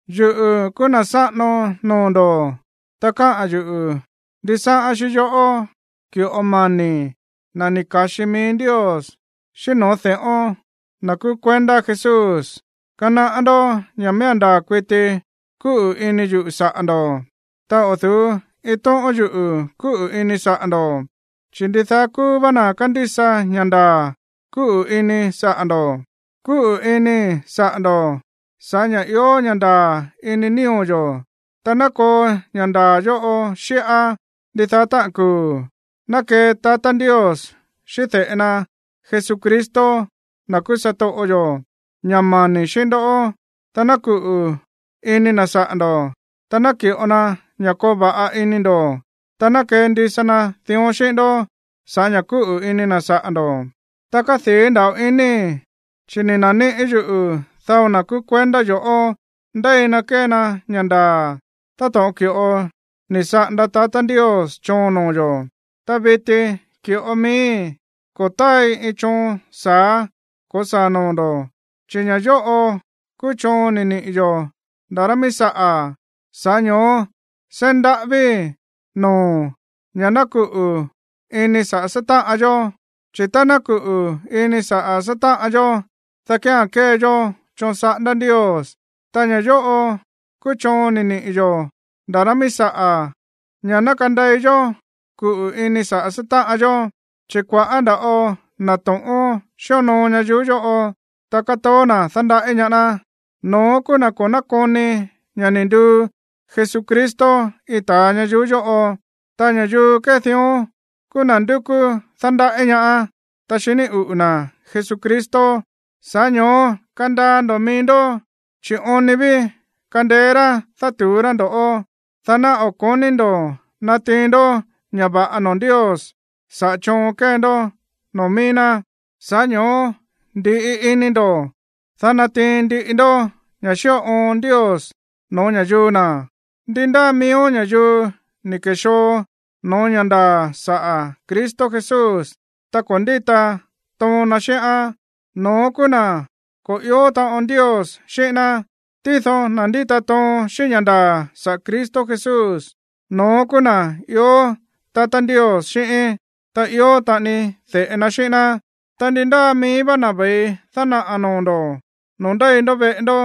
Yuꞌu̱ kúú na̱ sáꞌano noo̱ ndo̱, ta káꞌa̱n yuꞌu̱ ndisáꞌán xíꞌín yoꞌó, ki̱ꞌo mani̱í, na̱ ni̱ ka̱xi mií Ndios, xíꞌín no̱ó de̱ꞌón, na̱ kúú kuendá Jesús. Kanaꞌá ndó ña̱ miía̱n ndaa̱ kuiti kúꞌu̱ ini yuꞌu̱ saꞌa̱ ndo̱, ta o̱ du̱ú iin tóꞌón yuꞌu̱ kúꞌu̱ ini saꞌa̱ ndo̱, chi̱ ndidaá kúú vá na̱ kándísa ña̱ ndaa̱ kúꞌu̱ ini saꞌa̱ ndo̱. Kúꞌu̱ inii̱ saꞌa̱ ndo̱ꞌó sa̱ꞌá ña̱ ió ña̱ ndaa̱ ini nío̱ yo̱, ta ná koo ña̱ ndaa̱ yóꞌo xíꞌá ndidaá táꞌa̱n kuu̱. Ná kee tatá Ndios xíꞌín de̱ꞌe na Jesucristo, na̱ kúú satoꞌo yo̱, ña̱ mani̱ xíꞌín ndoꞌó, ta ná kuꞌu̱ ini na̱ saꞌa̱ ndo̱, ta naki̱ꞌo na ña̱ koo va̱ꞌa ini ndo̱. Ta ná kendisa na dión xíꞌín ndó sa̱ꞌá ña̱ kúꞌu̱ ini na̱ saꞌa̱ ndo̱. Ta kádii̱ nda̱ꞌo inii̱, chi̱ ni̱ na̱níꞌi̱ yuꞌu̱ dao na̱ kúú kuendá yo̱ꞌó ndéi na kée na ña̱ ndaa̱, táto̱ꞌon ki̱ꞌo ni̱ saꞌanda tatá Ndios choon noo̱ yo̱. Ta viti, ki̱ꞌo miíi̱, ko̱ táai iin choon sa̱á ko̱saa̱ noo̱ ndo̱, chi̱ ña̱ yóꞌo kúú choon ni̱ niꞌi̱ yo̱ nda̱ rá mií saꞌa̱, sa̱ꞌá ño̱ó seí ndaꞌávíi̱ noo̱o̱n ña̱ ná kuꞌu̱ ini saꞌa̱ sátáꞌan yó. Chi̱ tá ná kuꞌu̱ ini saꞌa̱ sátáꞌan yó, dá kía̱n kée yó choon saꞌándá Ndios. Ta ña̱ yóꞌo kúú choon ni̱ niꞌi̱ yo̱ nda̱ rá mií saꞌa̱ ña̱ ná kandei yó kuꞌu̱ ini saꞌa̱ sátáꞌan yó. Chi̱ kua̱ꞌá nda̱ꞌo na̱ to̱ꞌón xíonoo ñayuú yóꞌo, ta kátoó na̱ dándaꞌí ñaá ná. No̱ón kúú na̱ ko̱ nákoni ña̱ ni̱ nduu Jesucristo iin ta̱a ñayuú yóꞌo. Ta ña̱yuu kée dión kúú na̱ ndúkú dándaꞌí ñaá, ta xiní uꞌu̱ na̱ Jesucristo. Sa̱ꞌá ño̱ó kandaa ndo̱ mií ndó, chi̱ oon ni ví kandeé rá dátu̱ú rá ndo̱ꞌó, dá ná o̱ ko̱ní ndo̱ natiin ndó ña̱ va̱ꞌa noo̱ Ndios sa̱ꞌá choon kée ndó noo̱ mií ná. Sa̱ꞌá ño̱ó ndi̱ꞌi ini ndo̱, dá natiin ndiꞌi ndó ña̱ xíꞌo oon Ndios no̱ó ña̱yuu na̱. Ndi ndáa miíó ña̱yuu ni̱ ke̱xoo no̱ó ña̱ ndaa̱ saꞌa̱ Cristo Jesús, ta ko̱ ndíta toon na xíꞌán, no̱ón kúú na̱ ko̱ ió taꞌon Ndios xíꞌín ná. Tído na̱ ndíta toon xíꞌín ña̱ ndaa̱ saꞌa̱ Cristo Jesús, no̱ón kúú na̱ ió tatá Ndios xíꞌín, ta ió taꞌani de̱ꞌe na xíꞌín ná. Ta ndi ndáa mií vá na̱ ve̱i dánaꞌa̱ noo̱ ndo̱ noo̱ ndéi ndó veꞌe ndó,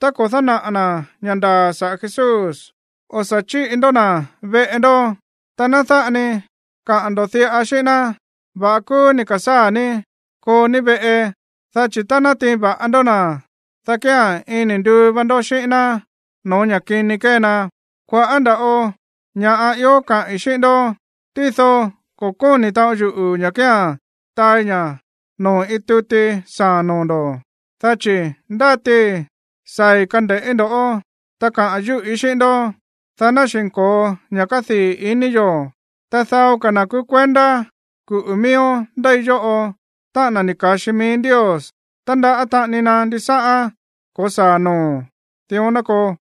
ta ko̱ dánaꞌa̱ na̱ ña̱ ndaa̱ saꞌa̱ Jesús, o̱ sa̱ chíꞌi ndó na̱ veꞌe ndó. Ta ná dáꞌa ni kaa ndo̱ diꞌa xíꞌín ná: “Va̱ꞌa kúú ni̱ ka̱sáa̱ ní. Koo ní veꞌe.” Dá chi̱ tá ná natiin va̱ꞌa ndó na̱, dá kía̱n iin ni̱ nduu va ndó xíꞌín ná no̱ó ña̱ kini kée na. Kua̱ꞌá nda̱ꞌo ña̱ꞌa ió kaꞌi̱n xíꞌín ndó, tído ko̱ kóni̱ taꞌon yuꞌu̱ ña̱ kía̱n taai ña̱ noo̱ iin tuti saa̱a̱n noo̱ ndo̱. Dá chi̱ ndátii saa̱i̱ kande̱ꞌí ndo̱ꞌó, ta kaꞌa̱n yúꞌí xíꞌín ndó, dá ná xi̱nko̱o ña̱ kádii̱ ini yo̱. Ta dao ka̱ na̱ kúú kuendá kuꞌu̱ miíón ndéi yóꞌo, táꞌa̱n na̱ ni̱ ka̱xi mií Ndios, tándaꞌá taꞌani na ndisáꞌán ko̱saa̱ noo̱o̱n. Dión ná koo.